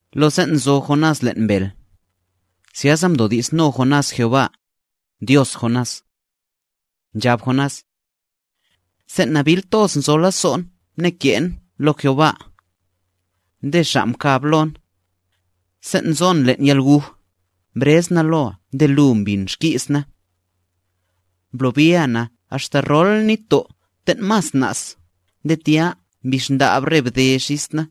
Lo sen' nzo Jonás len' mbel, zyasa mdodi'sno Jonás Jehová, Dios Jonás. Nchab Jonás: Sen' nabil toz nzo lazo'n mneke'n lo Jehová, nde Xa' mkab lon. Sen' nzon len' yalguj mbrez na loa nde lu mbin xki's na. Mblobia na axta rol nitto' ten' mas na's nde tya mbix ndab re bde xis na.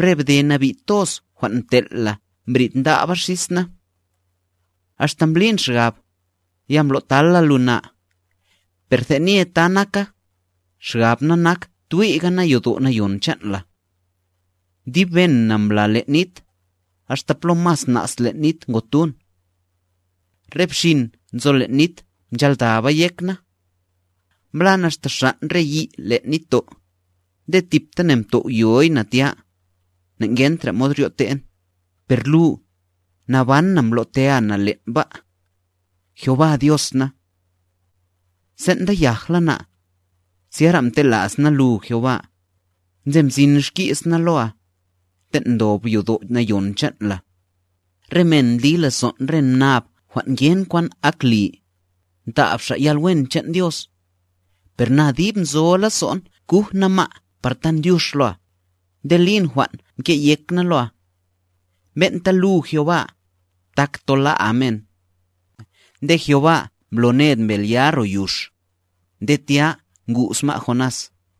Re bde nabi' toz jwan' mtel' la mbrid ndaba xis na. Axta mblin xgab, ya mblo'tala lu na, per tenye ta naka, xgab na nak twi'ga na yodo' nayon chan' la. Dib ben na mbla len' nit, axta plo mas na's len' nit ngotun. Re bxin nzo len' nit mchaldaba yek na. Mblan axta xan' re yi' len' nitto', nde tibtane mtow'yoy na tya, nangentra mod ryo'ten per lu, naban na mblotea na len' ba', Jehová Dios na. Sen' nda yajla na, zyara mtela's na lu, Jehová, nde mzin xki's na loa, ten' ndob yodo' nayon chan' la. Re men ndli lazo'n re mnab jwan' ngen kwan ak li, ntab xa' yalwen chan' Dios. Per na dib nzo lazo'n guj na ma'a par tan dyux loa, nde lin jwan' mke' yek na loa. Ben'ta lu Jehová, tak tola'a men. Nde Jehová mblo ned mbel ya ro yux, nde tya ngu's ma' Jonás.